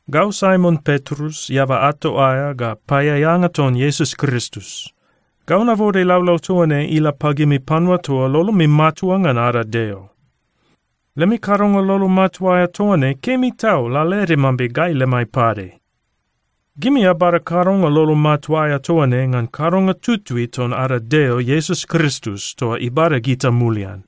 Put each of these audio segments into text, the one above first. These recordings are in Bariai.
Gau Saimon Petrus, eaba ato aea ga paeaeanga ton Iesus Kristus. Gau nabode laulau toa ne ila pagimi panua toa lolomi matua ngan ada Deo. Lemi kadonga lolo matua aea toa ne kemi tau lalaede mambe gai lemai pade. Gimi abada kadonga lolo matua aea toa ne ngan kadonga tutui ton ada Deo Iesus Kristus toa ibada gita mulian.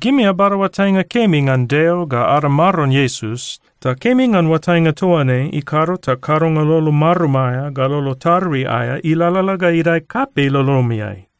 Gimi abada oatainga kemi ngan Deo ga ada Maron Iesus, ta kemi ngan oatainga toa ne ikado ta kadonga lolo marum aea ga lolo tarui aea ilalala ga idae kapei lolomiai.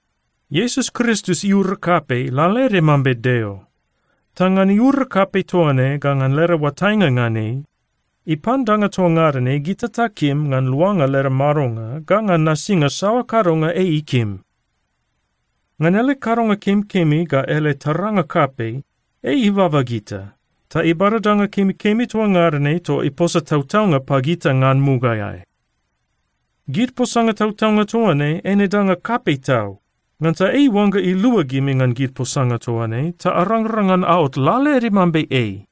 Iesus Kristus iura kapei lalaede mambe Deo. Ta ngan iura kapei toa ne ga ngan leda oatainga ngan ei, ipan danga toa ngada ne gita takim ngan luanga leda madonga ga ngan nasinga saoa kadonga ei ikim. Ngan ele kadonga kemikemi ga ele taranga kapei, ei ibaba gita ta ibada danga kemikemi toa ngada ne toa iposa tautaunga pagita ngan mugaeai. Gid posanga tautaunga toa ne eine danga kapei tau, ngansa ei iuangga ilua gimi ngan gid posanga toa ne ta arangrang ngan aot lalaede mambe ei.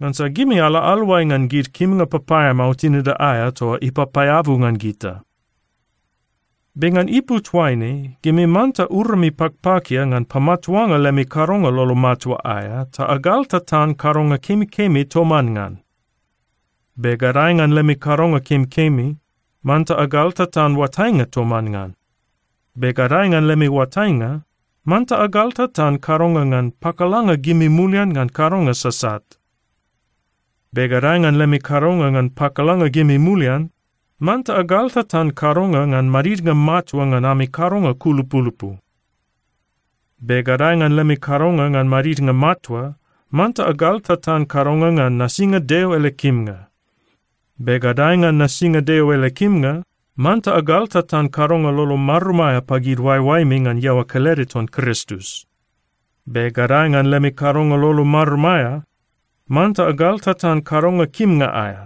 Ngansa gimi ala aluai ngan gid kimnga papaeamao tinida aea toa ipapaeabu ngan gita. Be ngan ipu toaine, gimi manta urami pakpakia ngan pamatuanga lemi kadonga lolo matua aea ta agaltatan kadonga kemikemi toman ngan. Be gadae ngan lemi kadonga kemikemi, manta agaltatan oatainga toman ngan. Be gadae ngan lemi oatainga, manta agaltatan kadonga ngan pakalanga gimi mulian ngan kadonga sasat. Be gadae ngan lemi kadonga ngan pakalanga gimi mulian, manta agaltatan kadonga ngan madidnga matua ngan ami kadonga kulupulupu. Be gadae ngan lemi kadonga ngan madidnga matua, manta agaltatan kadonga ngan nasinga Deo ele kimnga. Be gadae ngan nasinga Deo ele kimnga, manta agaltatan kadonga lolo marum aea pagid oaeoaemi ngan iaoa kelede ton Kristus. Be gadae ngan lemi kadonga lolo marum aea, manta agaltatan kadonga kimnga aea.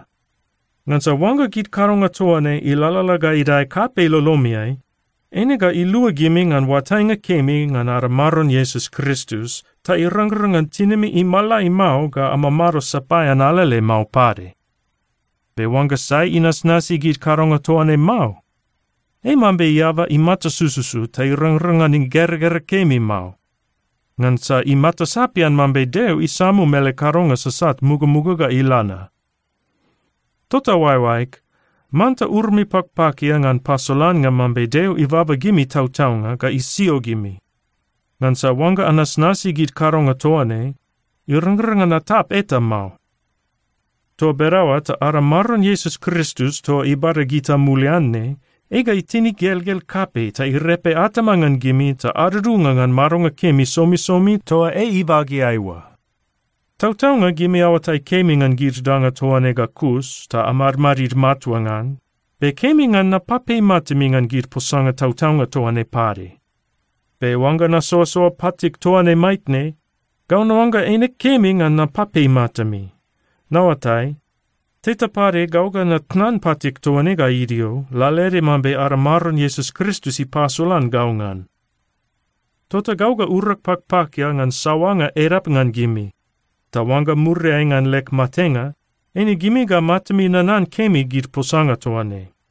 Ngansa oangga gid kadonga toa ne ilalala ga idae kapei lolomiai, eine ga ilua gimi ngan oatainga kemi ngan ada Maron Iesus Kristus ta irangrang ngan tinimi imalai mao ga amamado sapaean alele mao pade. Be oangga sai inasnasi gid kadonga toa ne mao, ei mambe eaba imata sususu ta irangrang ngan igeragera kemi mao, ngansa imata sapian mambe Deo isamum ele kadonga sasat mugamuga ga ila na. Tota oaeoaeg, manta urami pakpakia ngan pasolannga mambe Deo ibaba gimi tautaunga ga isio gimi. Ngansa oangga anasnasi gid kadonga toa ne, irangrang ngan atap eta mao. Toa bedaoa ta ada Maron Iesus Kristus toa ibada gita mulian ne, ei ga itin igelgel kapei ta irepe atama ngan gimi ta adudunga ngan madonga kemi somisomi toa ei ibageai oa. Tautaunga gimi aoatai kemi ngan gid danga toa ne ga kus, ta amadmadid matua ngan, be kemi ngan napapei matami ngan gid posanga tautaunga toa ne pade. Be oangga nasoasoa patig toa ne maitne, gau naoangga eine kemi ngan napapei matami. Naoatai, teta pade gau ga natnan patig toa ne ga idio, lalaede mambe ada Maron Iesus Kristus ipasolan gau ngan. Tota gau ga urag pakpakia ngan saoanga edap ngan gimi. Ta oangga muriai ngan leg matenga, eine gimi ga matami nanan kemi gid posanga toa ne.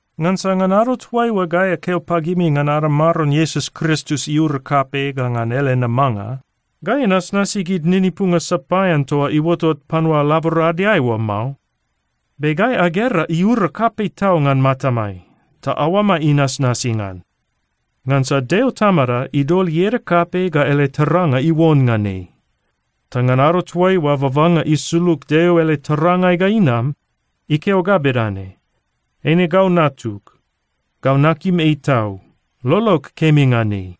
Ngansa ngan ado toaiua gai akeo pagimi ngan ada Maron Iesus Kristus iura kapei ga ngan ele namanga, gai anasnasi gid ninipunga sapaean toa iuotot panua laboradeai oa mao. Be gai agera iura kapei tau ngan matamai, ta aoamai inasnasi ngan. Ngansa Deo Tamada idol ieda kapei ga ele taranga iuon ngan ei. Ta ngan ado toaiua babanga isulug Deo ele tarangai ga inam, ikeo ga bedane, “Eine gau Natug. Gau nakim ei tau. Lolog kemi ngan ei.”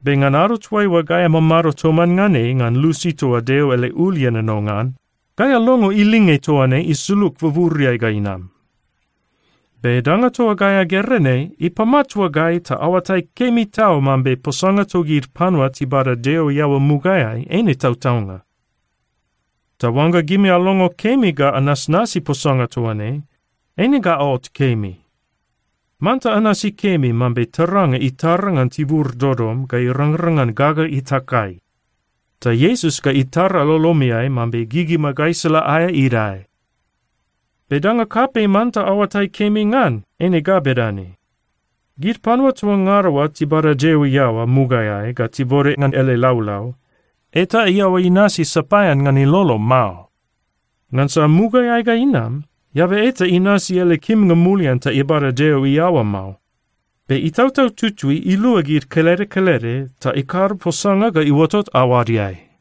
Be ngan ado toaiua gai amamado toman ngan ei ngan lusi toa Deo ele ul ienono ngan, gai alongo ilinge toa ne isulug buburiai ga inam. Be danga toa gai agera ne ipamatua gai ta aoatai kemi tau mambe posanga togid panua tibada Deo iaoa mugaeai eine tautaunga. Ta oangga gimi alongo kemi ga anasnasi posanga toa ne, eine ga aot kemi. Manta anasi kemi mambe taranga itara ngan tibur dodom ga irangrang ngan gaga itakai. Ta Iesus ga itara lolomiai mambe gigima gaisala aea idae. Be danga kapei manta aoatai kemi ngan eine ga bedane: Gid panua toa ngada oa tibada Deo iaoa mugaeai ga tibode ngan ele laulau, eta iaoa inasi sapaean ngan ilolo mao. Ngansa mugaeai ga inam, eaba eta inasi ele kimnga mulian ta ibada Deo iaoa mao. Be Itautau Tutui ilua gid kelede kelede ta ikado posanga ga iuotot aoadeai.